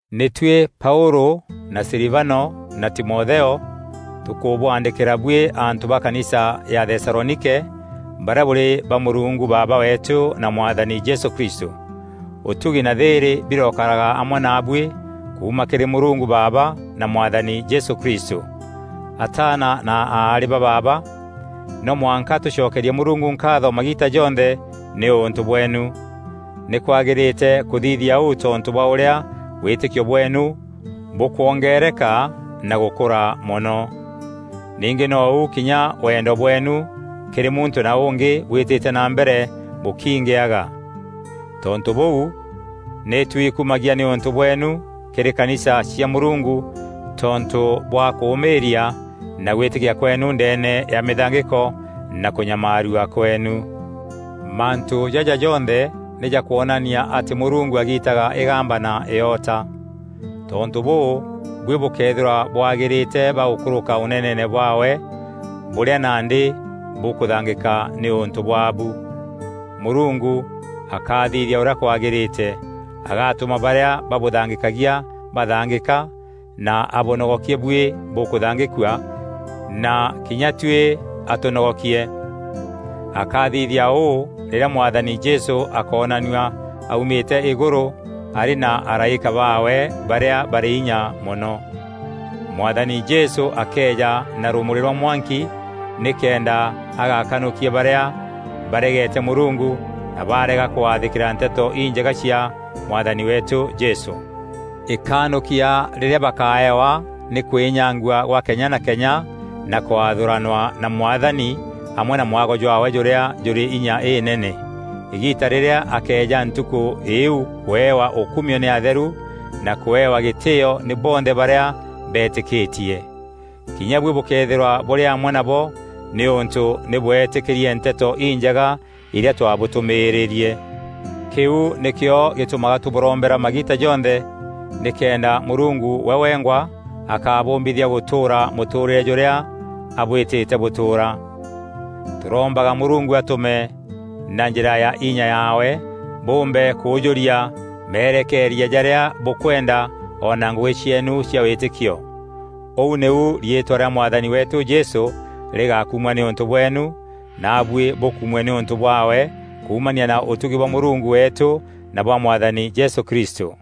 Nî tuî Paûlû na Silivano na Timotheo, tûkûbwaandîkîra buî antû ba Kanisa ya Thesalonike barîa bûrî ba Mûrungu Baaba weetû na Mwathani Jesû Kristû. Ûtugi na thîîrî birokaraga amwe naabuî kuuma kîrî Mûrungu Baaba na Mwathani Jesû Kristû. Ataana na aarî ba baaba, no mwanka tûcokerie Mûrungu nkaatho magiita jonthe nîûntû bweenu. Nîkwagîrîte kûthithia ûu tontû bwa ûrîa wîtîkio bweenu bûkwongeereka na gûkûra mono. Ningî nou kinya wendo bweenu kîrî muntû na ûngî bwîtîte na mbere bûkiingîaga. Tontû bûu, nî twikumagia nîûntû bweenu kîrî kanisa cia Mûrungu tontû bwa kûûmîîria na gwîtîkia kweenu ndeene ya mîthangîko na kûnyamaarua kweenu. Mantû jaja jonthe nî jakwonania atî Mûrungu agiitaga îgamba na îota. Tontû bûû, buî bûkeethîrwa bwagîrîte ba gûkûrûka Ûneneene bwaawe bûrîa nandî bûkûthangîka nîûntû bwaabu. Mûrungu akathithia ûrîa kwagîrîte: agatûma barîa babûthangîkagia bathangîka, na abûnogokie buî bûkûthangîkua na kinya tuî atûnogokie. Akathithia ûû rîrîa Mwathani Jesû akoonanua aumîte îgûrû arî na araîka baawe barîa barî inya mono. Mwathani Jesû akeeja na rûmûrî rwa mwanki nîkenda agakanûkia barîa baregete Mûrungu na baarega kwathîkîra Nteto Injega cia Mwathani weetû Jesû. Îkanûkia rîrîa bakaewa nî kwînyangua gwa kenya na kenya na kwathûranwa na Mwathani amwe na mwago jwaawe jûrîa jûrî inya înene, îgiita rîrîa akeeja ntukû îîu kûewa ûkumio nî atheru na kûewa gîtîîo nî bonthe barîa betîkîtie. Kinya buî bûkeethîrwa bûrî amwe nabo nîûntû nî bweetîkîrie Nteto Injega irîa twabûtûmîîrîrie. Kîu nîkîo gîtûmaga tûbûrombera magiita jonthe nîkenda Mûrungu we wengwa akabûmbithia gûtûûra mûtûûrîre jûrîa abwîtîte bûtûûra. Tûrombaga Mûrungu atûme na njîra ya inya yaawe bûûmbe kûûjûria merekeeria jarîa bûkwenda o na ngûgî cieenu cia wîtîkio. Ûu nîu riîtwa rîa Mwathani weetû Jesû rîgakumua nîûntû bweenu, naabuî bûkumue nîûntû bwaawe kuumania na ûtugi bwa Mûrungu weetû na bwa Mwathani Jesû Kristû.